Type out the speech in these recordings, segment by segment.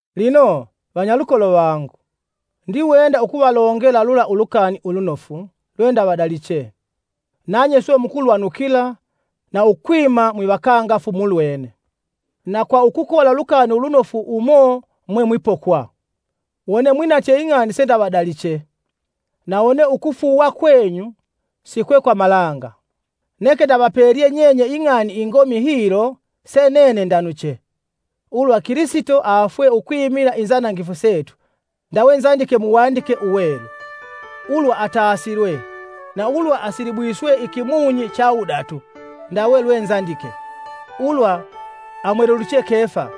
Lino, vanyalukolo vangu, ndiwenda ukuvalongela lula Ulukani Ulunofu lwendavadaliche, nanye swe mukulwanukila na ukwima mwivakangafu mulwene. Na kwa ukola Ulukani Ulunofu umo mwe mwipokwa, wone mwinatye ing'ani sendavadaliche, na wone ukufuuwa kwenyu si kwe kwa malanga. Neke ndavapelye nyenye ing'ani ingomi hilo se nene ndanuche: ulwa Kilisito afwe ukwimila inzanangifu setu ndawe nzandike Muwandike Uwelu, ulwa atasilwe, na ulwa asilibwiswe ikimunyi cha wudatu ndawe lwe nzandike; ulwa amweleluche Kefa,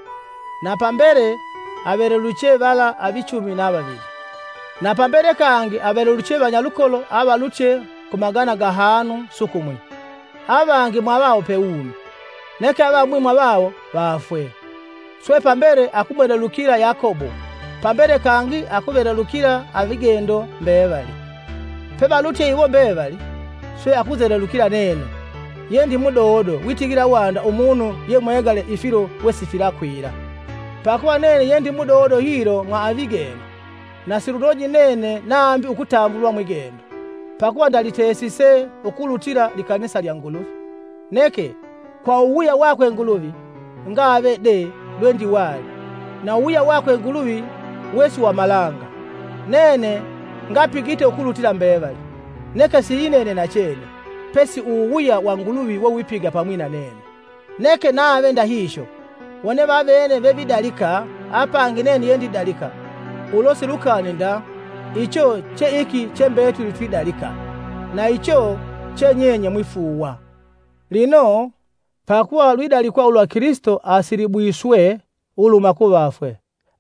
na pambele aveleluche vala avichumi na vavili. Na pambele kangi aveleluche vanyalukolo avalutye ku magana gahanu sukumwi; avangi mwavawo pewumi, neke avamwi mwavawo vaafwe. Swe pambele akumwelelukila Yakobo pambele kangi akuvelelukila avigendo mbevali. Pevalutye iwo mbevali, swe akunzelelukila nene, yendi mudodo witigila wanda umunu yemwegale ifilo wesifilakwila. Pakuva nene yendi mudodo hilo mwa avigendo, na silunoji nene nambi ukutambulwa mwigendo, pakuva ndalitesise ukulutila likanisa lya Nguluvi. Neke, kwa uwuwuya wakwe Nguluvi, ngave de lwendiwali, na uwuwuya wakwe Nguluvi we si wa malanga. Nene ngapigite ukulutila mbevali; neke siyinene nachene, pesi uwuwuya wa Nguluvi wewipiga pamwi na nene. Neke nave ndahihyo, wone vavene vevidalika apangi nene yendidalika, ulo silukani nda icho che iki che mbetuli twidalika, na icho che nyenye mwifuuwa. Lino, pakuva lwidalikwa ulwa Kilisito asilibwiswe uluhuma ku vafwe,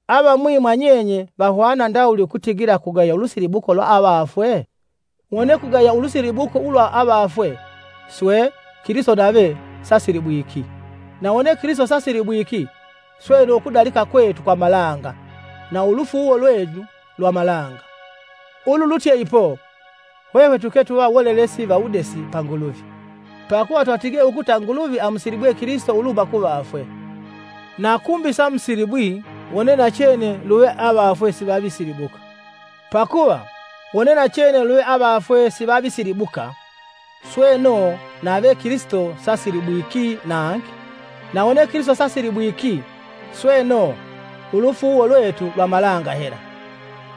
avamwi mwa nyenye vahwana ndawuli ukutigila kugaya ulusilibuko lwa avafwe? Wone kugaya ulusilibuko ulwa avafwe. swe, Kilisito nave sasilibwiki, na wone Kilisito sasilibwiki, sweno ukudalika kwetu kwa malanga na ulufuuwo lwenyu lwa malanga. Ululutye ipo, hwehwe tuke tuva wolelesi va wudesi pa Nguluvi, pakuva twatige ukuta Nguluvi amusilibwe Kilisito uluhuma ku vafwe, na kumbi samusilibwi wone-nachene luve avafwe sivavisilibuka. Pakuva, wone nachene luve avafwe sivavisilibuka, sweno nave Kilisito sasilibwiki nangi. Na wone Kilisito sasilibwiki, sweno, ulufuuwo lwetu lwa malanga hela,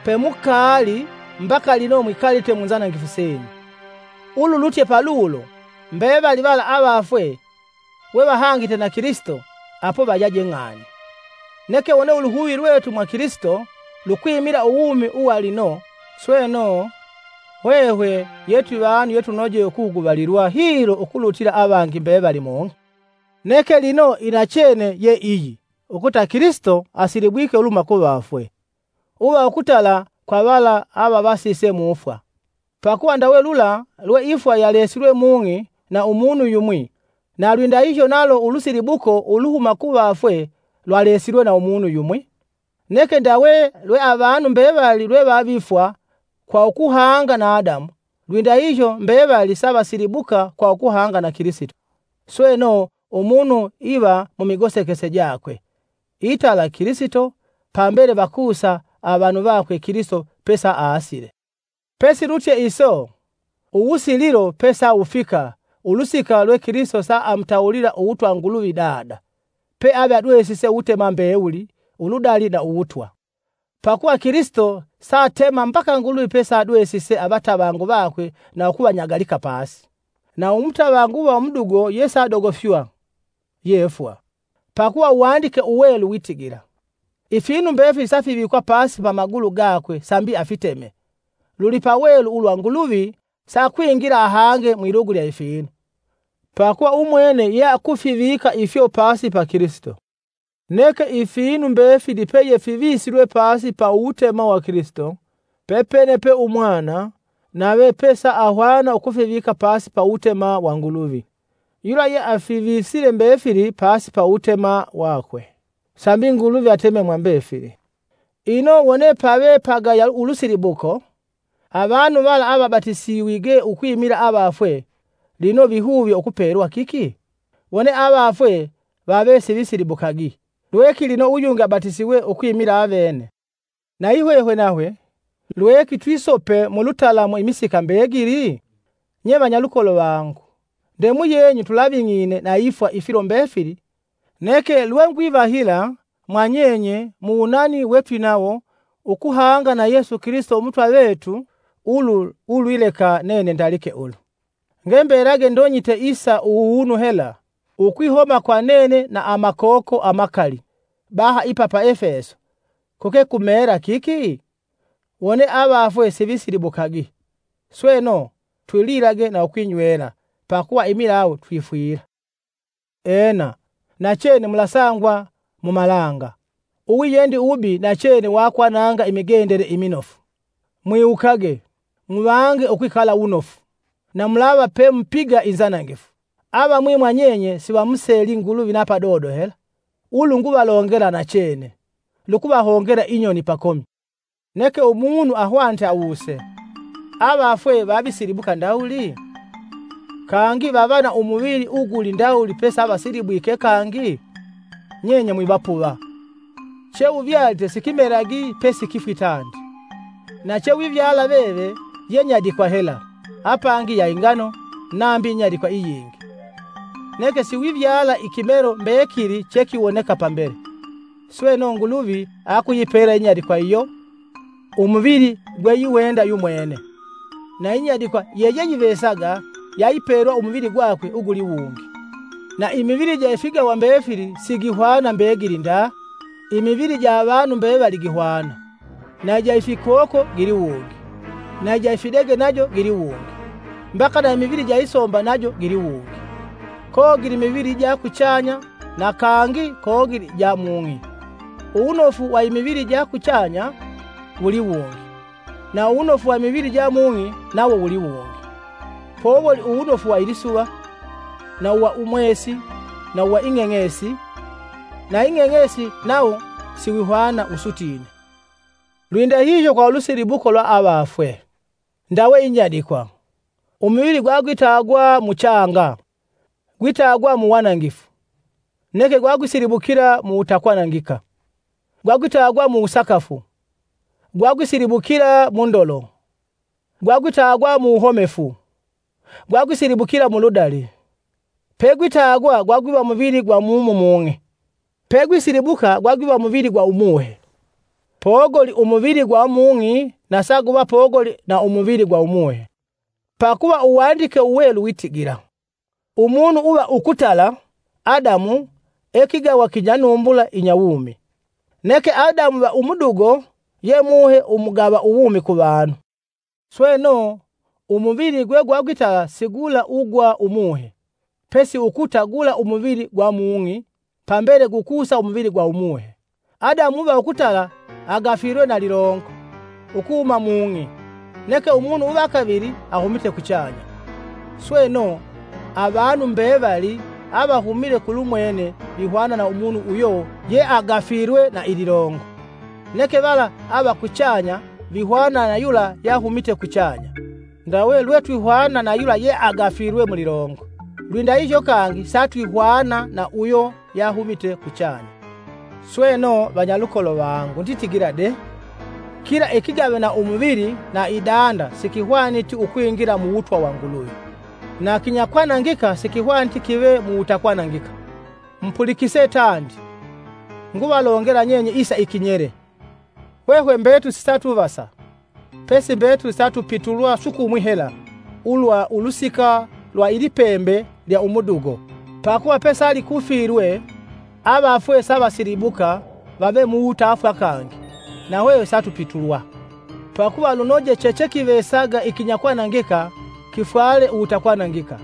pemukaali mbaka lino mwikalite mu nzanangifu senyu. Ululutye palulo, mbevali vala avafwe wevahangite na Kilisito apo vayaje ng'ani. Neke wone uluhuvi lwetu mwa Kilisito lukwimila uwumi uwa lino, sweno, hwehwe ye twivanu yetunoje ukuhuguvalilwa hilo ukulutila avangi mbevali mung'i. Neke lino inachene ye iyi ukuta Kilisito asilibwike uluhuma kuvafwe, uva ukutala kwa vala avavasise mu fwa. Pakuva ndawe lula lwe ifwa yalesilwe mung'i na umunu yumwi, na lwindahihyo nalo ulusilibuko uluhuma ku vafwe lwalesilwe na umunu yumwi. Neke ndawe lwe avanu mbevali lwevavifwa kwa ukuhanga na Adamu, lwindahihyo mbevali savasilibuka kwa ukuhanga na Kilisito. Sweno umunu iva mumigosekese jakwe: itala Kilisito; pambele vakusa avanu vakwe Kilisito pesaasile. Pesilutye iso, uwusililo pesawufika ulusika lwe Kilisito saamutawulila uwutwa Nguluvi Dada, peave adwesise uwutema mbewuli, uludali na uwutwa. Pakuva Kilisito satema mbaka Nguluvi peavadwesise avatavangu vakwe na ukuvanyagalika pasi. Na umutavangu uwa umudugo yesaadogofywa ye fwa. Pakuva Uwandike Uwelu witigila, “Ifinu mbefili safivikwa pasi pa magulu gakwe sambi afiteme, lulipawelu ulwa Nguluvi sakwingila ahange mwilugu lya ifinu, pakuva umwene yeakufivika ifyo pasi ya Kilisito.” Neke ifinu mbefili peyefivisilwe pasi ya uwutema wa Kilisito, pepene pe umwana, nave pesaahwana ukwivika pasi ya uwutema wa Nguluvi, yula yeafivisile mbefili pasi ya uwutema wakwe, sambi Nguluvi ateme mwa mbefili. Ino wone pave pagaya ulusilibuko, avanu vala avabatisiwige ukwimila avafwe, lino vihuvye ukupelwa kiki? Wone avafwe vave sivisilibukagi, lweki lino uyungi abatisiwe ukwimila avene. Nayihwehwe nahwe, lweki twisope mulutalamu imisika mbegili? Nye vanyalukolo vangu, ndemuyenyu tulaving'ine na ifwa ifilo mbefili neke lwengwivahila mwanyenye muwunani wetwinawo ukuhanga na Yesu Kilisito Umutwa vetu ulu ulwileka nene ndalike ulu. Ngembelage ndonyite isa uwunu hela, ukwihoma kwa nene na amakoko amakali baha ipa pa Efeso, kuke kumeela kiki? Wone avafwe sivisilibukagi, sweno, “Twililage na ukwinywela, pakuva imilawu twifwila.” Ena, nachene mulasangwa mumalanga! Uwiyendi uwubi nachene wakwananga imigendele iminofu. Mwiwukage! Muvange ukwikala wunofu, na mulava pemupiga inzanangifu. Avamwi mwanyenye sivamuseli Nguluvi na padodo hela. Ulu nguvalongela nachene, lukuvahongela inyoni pakomi. Neke umunu ahwanite awuse: “Avafwe vavisilibuka ndawuli? Kangi vava na umuvili uguli ndawuli pesavasilibwike kangi?” Nyenye mwivapuva! Cheuvyalite sikimelagi pesikifwi tandi. Na chewivyala veve ye nyadikwa hela, apangi ya ingano nambi nyadikwa iyingi, neke siwivyala ikimelo mbekili chekiwoneka pambele. Sweno Nguluvi akuyipela inyadikwa iyo, umuvili gweiwenda yumwene, na inyadikwa yeyeyivesaga yayipelwa umuvili gwakwe uguli wungi. Na imivili ja ifigawa mbefili sigihwana mbegili nda. Imivili ja avanu mbevali gihwana, na ija ifikoko giliwungi, na ija ifidege najo giliwungi, mbaka na imivili ija isomba najo giliwungi. Kogili imivili ija kuchanya na kangi kogili ja mung'i; uwunofu wa imivili ja kuchanya wuliwungi, na uwunofu wa imivili ja mung'i, nawo wuliwungi. Powoli uwunofu wa ilisuva, na uwa umwesi na wa ing'eng'esi na ing'eng'esi nawo siwihwana wusutine. Lwindahiyo kwa ulusilibuko lwa avafwe. Ndawe inyadikwa, umuvili gwagwitagwa mu changa, gwitagwa muwanangifu, neke gwagwisilibukila mu wutakwanangika. Gwagwitagwa mu wusakafu, gwagwisilibukila mu ndolo; gwagwitagwa mu wuhomefu, gwagwisilibukila mu ludali. Pegwitagwa gwagwiva muvili gwa mumu mung'i, pegwisilibuka gwagwiva muvili gwa umuhe. Pogoli umuvili gwa mung'i na saguva pogoli na umuvili gwa umuhe. Pakuva Uwandike Uwelu witigila, “Umunu uva ukutala, Adamu, e kigawa kinyanumbula inya wumi;” neke Adamu uva umudugo, ye Muhe umugava uwumi ku vanu. Sweno umuvili gwegwagwitala si gula ugwa umuhe, pesi ukuta gula umuvili gwa mung'i pambele gukusa umuvili gwa umuhe. Adamu uva ukutala agafilwe na lilongo ukuhuma mung'i neke umunu uva kavili ahumite kuchanya. Sweno, avanu mbevali avahumile kulumwene vihwana na umunu uyo yeagafilwe na ililongo; neke vala ava kuchanya vihwana na yula yahumite kuchanya. Ndawe lwe twihwana na yula yeagafilwe mulilongo, lwindahihyo kangi satwihwana na uyo yahumite kuchanya. Sweno, vanyalukolo vangu, nditigila de: kila ikigave na umuvili na idanda sikihwaniti ukwingila mu Wutwa wa Nguluvi, na kinyakwanangika sikihwaniti kive muwutakwanangika. Mupulikise tandi, nguvalongela nyenye isa ikinyele: hwehwe mbetuli sisatuvasa, pesi mbetuli satupitulwa sukumwi hela ulwa ulusika lwa ilipembe lya umudugo, pakuva pakuva pesalikufilwe, avafwe savasilibuka vave muwutafwa kangi, na hwehwe satupitulwa. Pakuva lunoje chechekivesaga ikinyakwanangika kifwale uwutakwanangika,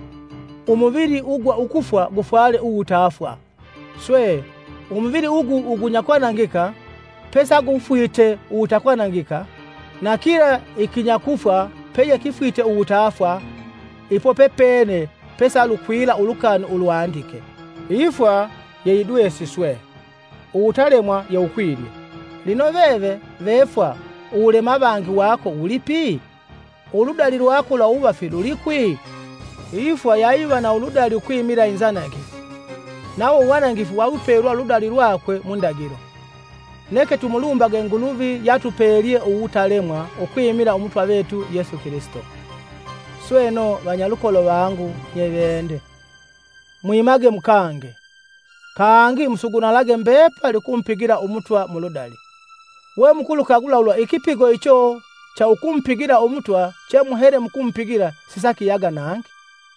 umuvili ugwa kufwa gufwale uwutafwa. Swe, umuvili ugu ugunyakwanangika pesaguvagufwite uwutakwanangika, na kila ikinyakufwa peyekifwite uwutafwa, ipo pepene pesalukwila ulukani ulwandike: “Ifwa yeyidwesiswe; uwutalemwa yewukwilye!” “Lino veve vefwa uwulema avangi wako wulipi? Uludali lwako lwa uwuvafi lulikwi?” Ifwa yayiva na uludali ukwimila inzanangifu nawo uwanangifu wawipelwa uludali lwakwe mu ndagilo. Neke tumulumbage Nguluvi yatupelye uwutalemwa ukwimila Umutwa vetu Yesu Kilisito. Sweno, vanyalukolo vangu nyevende, mwimage mukange. Kangi musugunalage mbepali ukumupigila Umutwa muludali, we mukulukagula ulwa ikipigo icho cha ukumupigila Umutwa chemuhele mukumupigila sisakiyaga nangi.